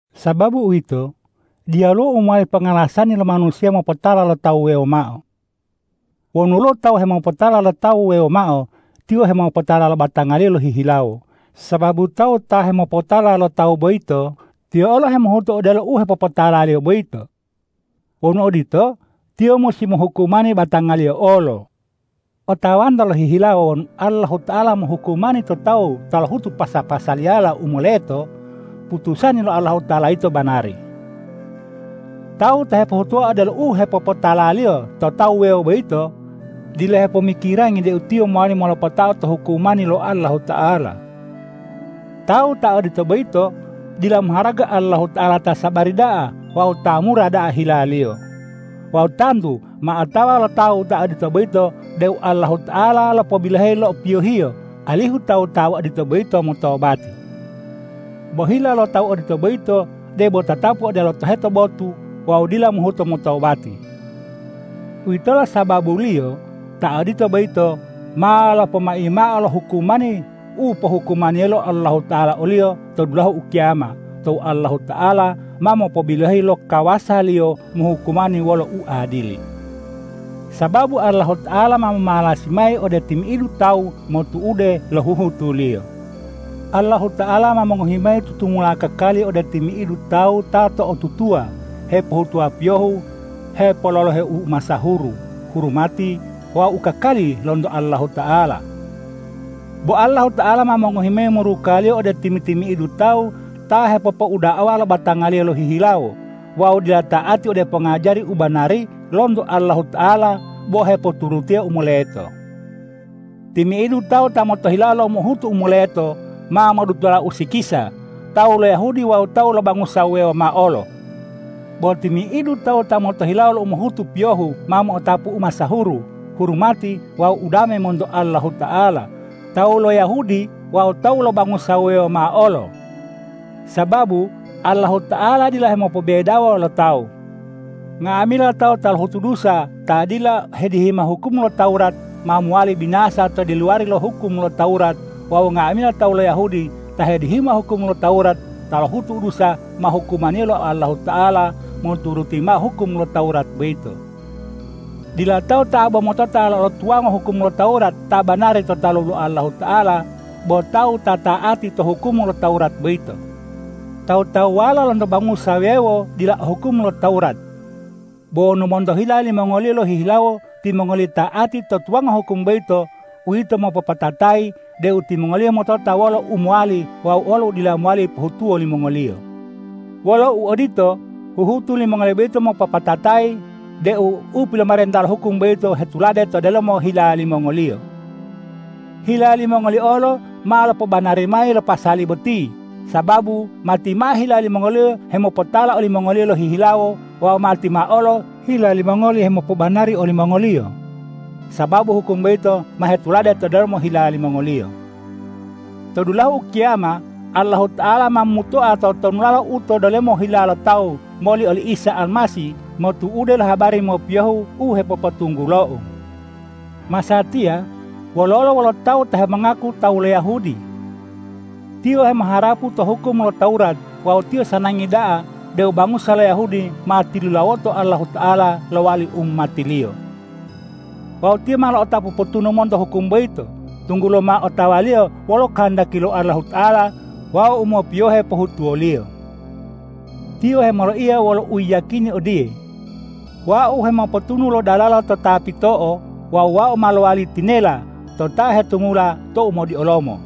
Sababu uwito, diyaluwo u mowali pongalasani lo manusiya mopotala lo tawu wuwewo mao. Wonu woluwo tawu ta hemopotala lo tawu wuwewo mao, tiyo hemopotala lo batangaliyo lohihilawo, sababu tawu ta hemopotala lo tawu boyito, tiyo olo hemohutu odelo u hepopotalaliyo boyito. Wonu odito, tiyo musi mohukumani batangaliyo olo. Otawanto lohihilawo wonu Allahuta'ala mohukumani to tawu ta lohutu pasa-pasaliyala u moleto, putusani lo Allahuta'ala yito banari. Tawu ta hepohutuwa odelo u hepopotalaliyo to tawu wuwewo boyito, dila hepomikirangi deu tiyo mowali molopatao to hukumani lo Allahuta'ala. Tawu ta odito boyito dila moharaga Allahuta'ala ta sabari da'a wawu ta mura da'a hila-Liyo. Wawu tantu ma otawa lo tawu ta odito boyito deu Allahuta'ala lopobiloheyi lo piyohiyo, alihu tawu ta odito boyito motobati. Bo hila lo tawu ta odito boyito debo tatapu odelo toheto botu wawu dila mohuto motobati. Uwitolo sababuliyo ta odito boyito ma lopoyimoao lo hukumani u pohukumani lo Allahuta'ala oliyo to dulahu ukiyama tou Allahuta'ala ma mopobiloheyi lo kawasa-Liyo mohukumani wolo uadili, sababu Allahuta'ala ma momalasi mayi ode timi'idu tawu motu'ude lo huhutuliyo. Allahuta'ala ma mongohi mayi tutumula kakali ode timi'idu tawu ta to'otutuwa hepohutuwa piyohu hepololohe umasahuru, hurumati wawu u kakali lonto Allahuta'ala. Bo Allahuta'ala ma mongohi mao muruka-Liyo ode timi-timi'idu tawu ta hepopouda'awa lo batangaliyo lohihilawo wawu dila ta'ati ode pongajari u banari lonto Allahuta'ala bo hepoturutiya u moleto. Timi'idu tawu ta motohilawo lo umohutu u moleto ma modutola usikisa, tawu lo Yahudi wawu tawu lo bangusa wuwewo mao olo. Bo timi'idu tawu ta motohilawo lo umohutu piyohu ma mo'otapu umasahuru, hurumati wawu udame monto Allahuta'ala, tawu lo Yahudi wawu tawu lo bangusa wuwewo mao olo. Sababu Allahuta'ala dila hemopobebedawo lo tawu. Nga'amila tawu ta lohutu dusa ta dila hedihima hukum lo Tawurat ma mowali binasa to diluwari lo hukum lo Tawurat wawu nga'amila tawu lo Yahudi ta hedihima hukum lo Tawurat ta lohutu dusa ma hukumaniyo lo Allahuta'ala moturuti mao hukum lo Tawurat boyito. Dila tawu ta bo motota lo tuwango hukum lo Tawurat ta banari to talu lo Allahuta'ala bo tawu ta ta'ati to hukum lo Tawurat boyito. Tawu-tawuwala lonto bangusa wuwewo dila o hukum lo Tawurat. Bo wonu monto hila limongoliyo lohihilawo timongoliyo ta'ati to tuwango hukum boyito, uwito mopopatatayi deu timongoliyo motota wolo u mowali wawu u dila mowali pohutuwo limongoliyo. Wolo uodito, huhutu limongoliyo boyito mopopatatayi deu u pilomarenta lo hukum boyito hetulade to delomo hila limongoliyo. Hila limongoliyo olo ma lopobanari mayi lo pasali boti, sababu matimao hila limongoliyo hemopotala olimongoliyo lohihilawo wawu matimao olo hila limongoli hemopobanari olimongoliyo, sababu hukum boyito ma hetulade to delomo hila limongoliyo. To dulahu ukiyama Allahuta'ala ma momutoa totonulala u to delomo hila lo tawu moli oli Isa Almasih motu'ude lo habari mopiyohu u hepopotunggulou. Masatiya wololo wolo tawu ta hemongaku tawu lo Yahudi? Tiyo hemoharapu to hukum lo Tawurat wawu tiyo sanangi da'a deu bangusa lo Yahudi ma tilulawoto Allahuta'ala lowali umati-Liyo. Wawu tiyo ma lo'otapu potunu monto hukum boyito, tunggulo ma otawaliyo wolo kohondaki lo Allahuta'ala wawu u mopiyohe pohutuwaliyo. Tiyo hemoloiya wolo uyiyakini odiye,”Wau hemopotunu lo dalala to ta pito'o wawu wau ma lowali tinela to ta hetumula to umodiolomo.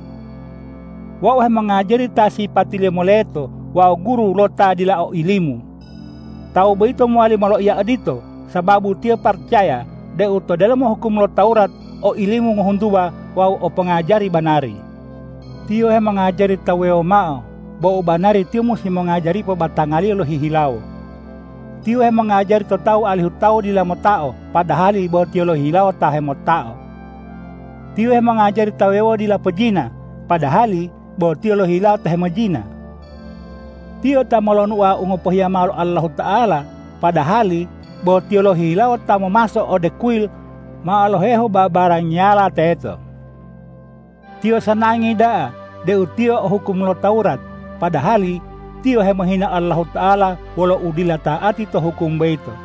Wau hemongajari ta sipatiliyo moleto wawu guru lo ta dila o ilimu.” Tawu boyito mowali moloiya odito, sababu tiyo paracaya deu to delomo hukum lo Tawurat o ilimu ngohuntuwa wawu o pongajari banari. Tiyo hemongajari tawu wuwewo mao, bo u banari tiyo musi mongajaripo batangaliyo lohihilawo. Tiyo hemongajari to tawu alihu tawu dila motao, padahali bo tiyo lohihilawo ta hemotao. Tiyo hemongajari tawu wuwewo dila pojina, padahali bo tiyo lohihilawo ta hemojina. Tiyo ta molonuo u ngopohiya mao lo Allahuta'ala, padahali bo tiyo lohihilawo ta momaso ode kuyil mao lohehu babarangiyala teto. Tiyo sanangi da'a deu tiyo o hukum lo Tawurat, padahali tiyo hemohina Allahuta'ala wolo udila ta'ati to hukum boyito.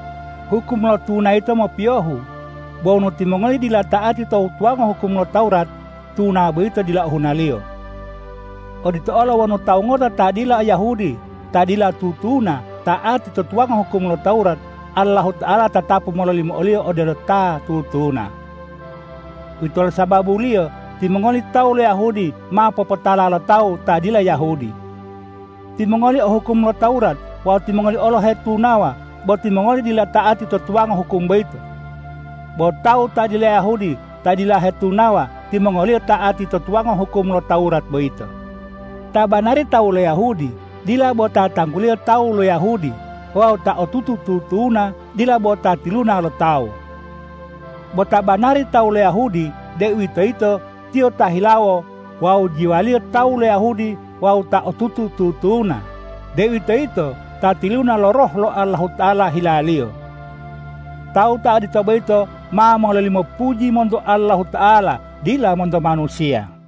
Hukum lo tuna yito mopiyohu. Bo wonu timongoli dila ta'ati to tuwango hukum lo Tawurat, tuna boyito dila ohunaliyo. Odito olo wonu tawu ngota ta dila Yahudi ta dila tutuna ta'ati to tuwango hukum lo Tawurat, Allahuta'ala tatapu mololimo oliyo odelo ta tutuna. Uwitolo sababuliyo timongoli tawu lo Yahudi ma popotala lo tawu ta dila Yahudi. Timongoli o hukum lo Tawurat wawu timongoli olo hetunawa, bo timongoli dila ta'ati to tuwango hukum boyito. Bo tawu ta dila Yahudi ta dila hetunawa, timongoliyo ta'ati to tuwango hukum lo Tawurat boyito. Ta banari tawu lo Yahudi dila bo ta tangguliyo tawu lo Yahudi wawu ta otutu tutuna dila bo ta tiluna lo tawu. Bo ta banari tawu lo Yahudi, deuwitoyito tiyo ta hilawo wawu jiwaliyo tawu lo Yahudi wawu ta otutu tutuna, deuwitoyito ta tiluna lo Roh lo Allahuta'ala hilaliyo. Tawu ta odito boyito ma mololimo puji monto Allahuta'ala, dila monto manusiya.